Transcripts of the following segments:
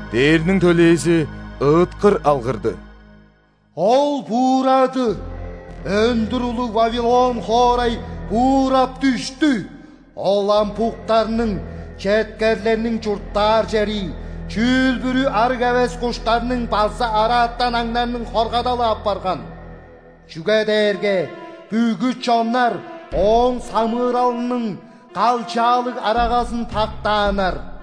Дээрниң төлээзи ыыткыр алгырды: «Ол буурады! Өндүр улуг Вавилон хоорай буурап дүштү! Ол ам буктарның, четкерлерниң чурттаар чери, чүүл-бүрү ·арыг эвес куштарның база араатан аңнарның хоргадалы апарган. Чүге дээрге бүгү чоннар ооң самыыралының калчаалыг арагазын пактааннар.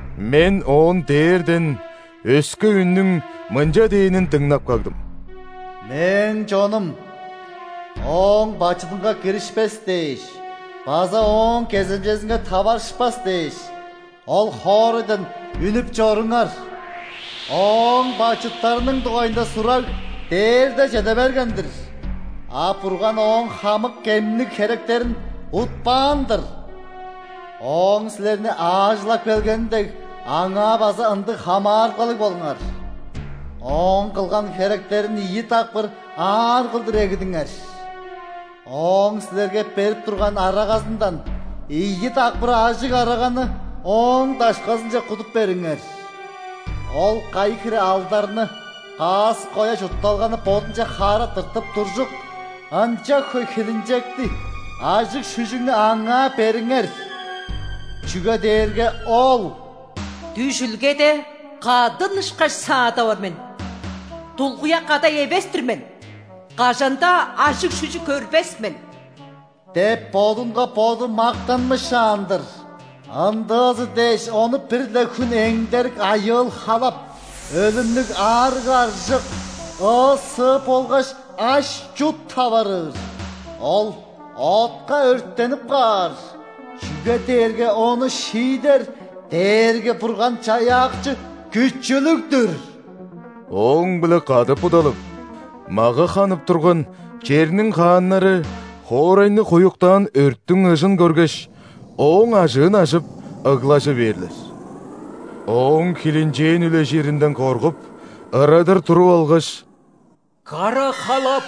Мен оон дээрден өске үннүң мынча дээнин дыңнап кагдым: «Мээң чонум, ооң бачыдынга киришпес дээш база ооң кеземчезинге таварышпас дээш, ол хоорайдан үнүп чоруңар. Ооң бачыттарының дугайында сураг дээрде чеде берген-дир, а Бурган ооң хамык кемниг херектерин утпаан-дыр. Ооң силерни аажылап келгени дег, аңаа база ындыг хамаарылгалыг болуңар, ооң кылган херектерин ийи дакпыр аар кылдыр эгидиңер. Ооң силерге берип турган арагазындан ийи дакпыр ажыг араганы ооң дашказынче кудуп бериңер. Ол кайы хире алдарны, каас-коя чуртталганы бодунче хаара тыртып туржук, ынча хөй хилинчекти, ажыг-шүжүгнү аңаа бериңер. Чүге дээрге ол: „Дүжүлгеде кадын ышкаш саадап ор мен! Дулгуяк кадай эвес-тир мен. Кажан-даа ажыг-шүжүг көрбес мен!“ – деп бодунга боду мактанмышаан-дыр. Ындыызы дээш, ону бир-ле хүн эңдерик айыыл-халап: өлүмнүг аарыг-аржык, ыы-сыы болгаш аш-чут таварыыр. Ол отка өрттенип каар, чүге дээрге ону шиидер Дээрги-Бурган-Чаяакчы күчүлүг-дүр». Ооң-биле кады будалып, мага ханып турган черниң хааннары хоорайны хуюктаан өрттүң ыжын көргеш, ооң ажыын ажып, ыглажы бээрлер. Ооң хилинчээн үлежиринден коргуп, ырадыр туруп алгаш: «Кара халап!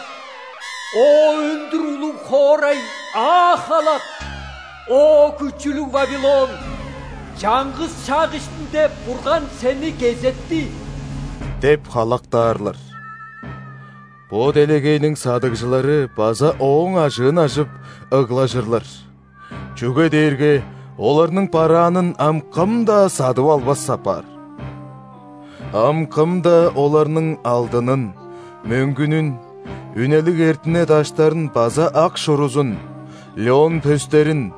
О, өндүр улуг хоорай, аа халак! О, күчүлүг Вавилон! Чаңгыс шак иштинде Бурган сени кезетти!» – деп халактаарлар. Бо делегейниң садыгжылары база ооң ажыын ажып, ыглажырлар, чүге дээрге оларның бараанын ам кым-даа садып албас апаар. Ам кым-даа оларның алдынын, мөңгүнүн, үнелиг эртине даштарын база ак шурузун, лён пөстерин,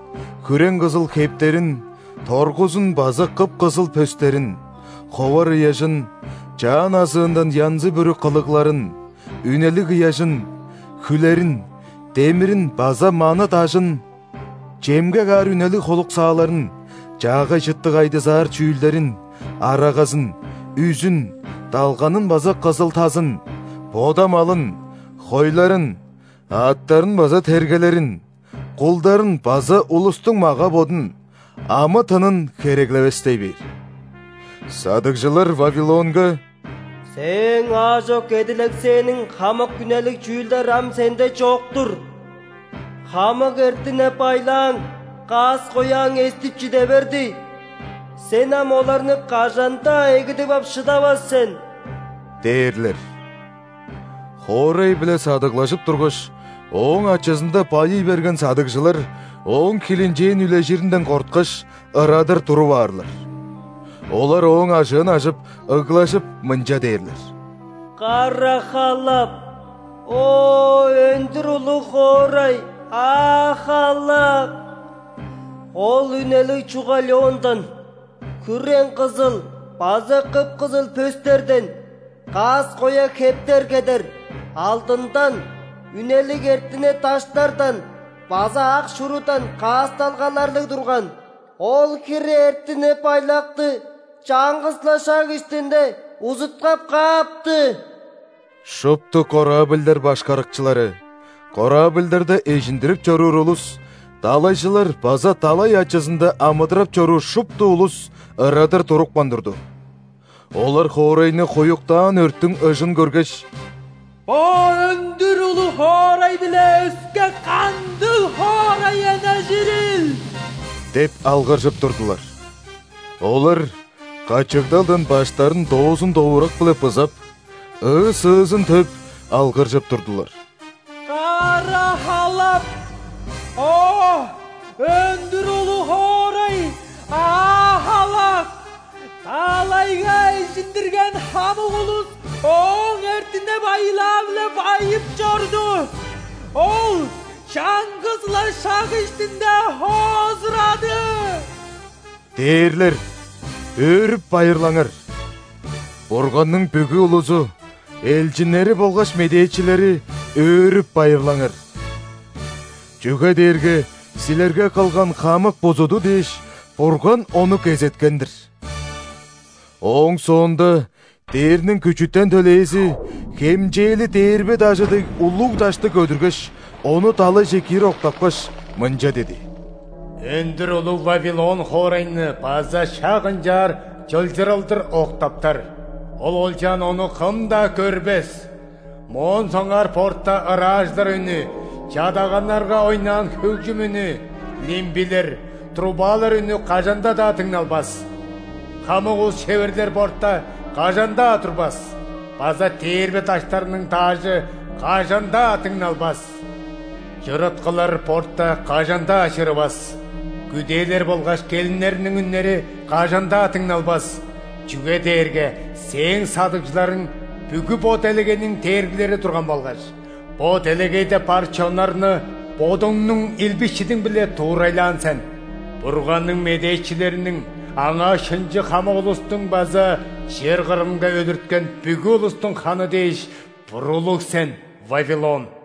хүрең-кызыл хептерин, торгузун база кып-кызыл пөстерин, ховар ыяжын, чаан азыындан янзы-бүрү кылыгларын, үнелиг ыяжын, хүлерин, демирин база маны дажын, чемге каар үнелиг холуксааларын, чаагай чыттыг айдызаар чүүлдерин, арагазын, үзүн, далганын база кызыл-тазын, бода малын, хойларын, аъттарын база тергелерин, кулдарын база улустуң мага-бодун, амы-тынын хереглевестей бээр. Садыгжылар Вавилонга: «Сээң аажок эдилексээниң хамык үнелиг чүүлдер ам сенде чок-тур. Хамык эртине-байлааң, каас-кояң эстип чиде берди, сен ам оларны кажан-даа эгидип ап шыдавас сен» – дээрлер. Хоорай-биле садыглажып тургаш, ооң ачызында байый берген садыгжылар ооң хилинчээн үлежиринден корткаш, ырадыр туруп аарлар. Олар ооң ажыын ажып, ыглажып, мынча дээрлер: «Кара халап! О, өндүр улуг хоорай, аа халак! Ол үнелиг чуга лёндан, хүрең-кызыл база кып-кызыл пөстерден каас-коя хептер кедер, алдындан, үнелиг эртине даштардан база ак шурудан каасталгаларлыг турган. Ол хире эртине-байлакты чаңгыс-ла шак иштинде узуткап каапты!» Шупту корабльдар башкарыкчылары, корабльдарда эжиндирип чоруур улус, далайжылар база далай ачызында амыдырап чоруур шупту улус ырадыр турупкан турду. Олар хоорайны хуюктаан өрттүң ыжын көргеш: «Бо өндүр улуг хоорай-биле өске кандыг хоорай эннежирил?» – деп алгыржып турдулар. Олар качыгдалдан баштарын доозун-довурак-биле бызап, ыы-сыызын төп, алгыржып турдулар: «Кара халап! О, өндүр улуг хоорай, аа халак! Далайга эжиндирген хамык улус ооң эртине-байлаа-биле байып чорду. Ол чаңгыс-ла шак иштинде хоозурады». Дээрлер, өөрүп-байырлаңар! Бурганның бүгү улузу, элчиннери болгаш медээчилери, өөрүп-байырлаңар! Чүге дээрге силерге кылган хамык бузуду дээш, Бурган ону кезеткен-дир! Ооң соонда дээрниң күчүтен төлээзи хемчээли дээрбе дажы дег улуг дашты көдүргеш, ону далайже киир октапкаш, мынча диди: «Өндүр улуг Вавилон хоорайны база шак ынчаар чылчырылдыр октаптар, ол олчаан ону кым-даа көрбес! Моон соңгаар борта ыраажылар үнү, чадаганнарга ойнаан хөгжүм үнү, лимбилер, трубалар үнү кажан-даа дыңналбас. Хамык ус-шеверлер борта кажан-даа турбас база дээрбе даштарының даажы кажан-даа дыңналбас. Чырыткылар борта кажан-даа чырывас, күдээлер болгаш келиннерниң үннери кажан-даа дыңналбас. Чүге дээрге сээң садыгжыларың бүгү бо делегейниң дээргилери турган болгаш, бо делегейде бар чоннарны бодуңнуң илби-шидиң-биле дуурайлаан сен. Бурганның медээчилериниң, Аңаа шынчы хамык улустуң база чер кырынга өлүрткен бүгү улустуң ханы дээш буруулуг сен, Вавилон».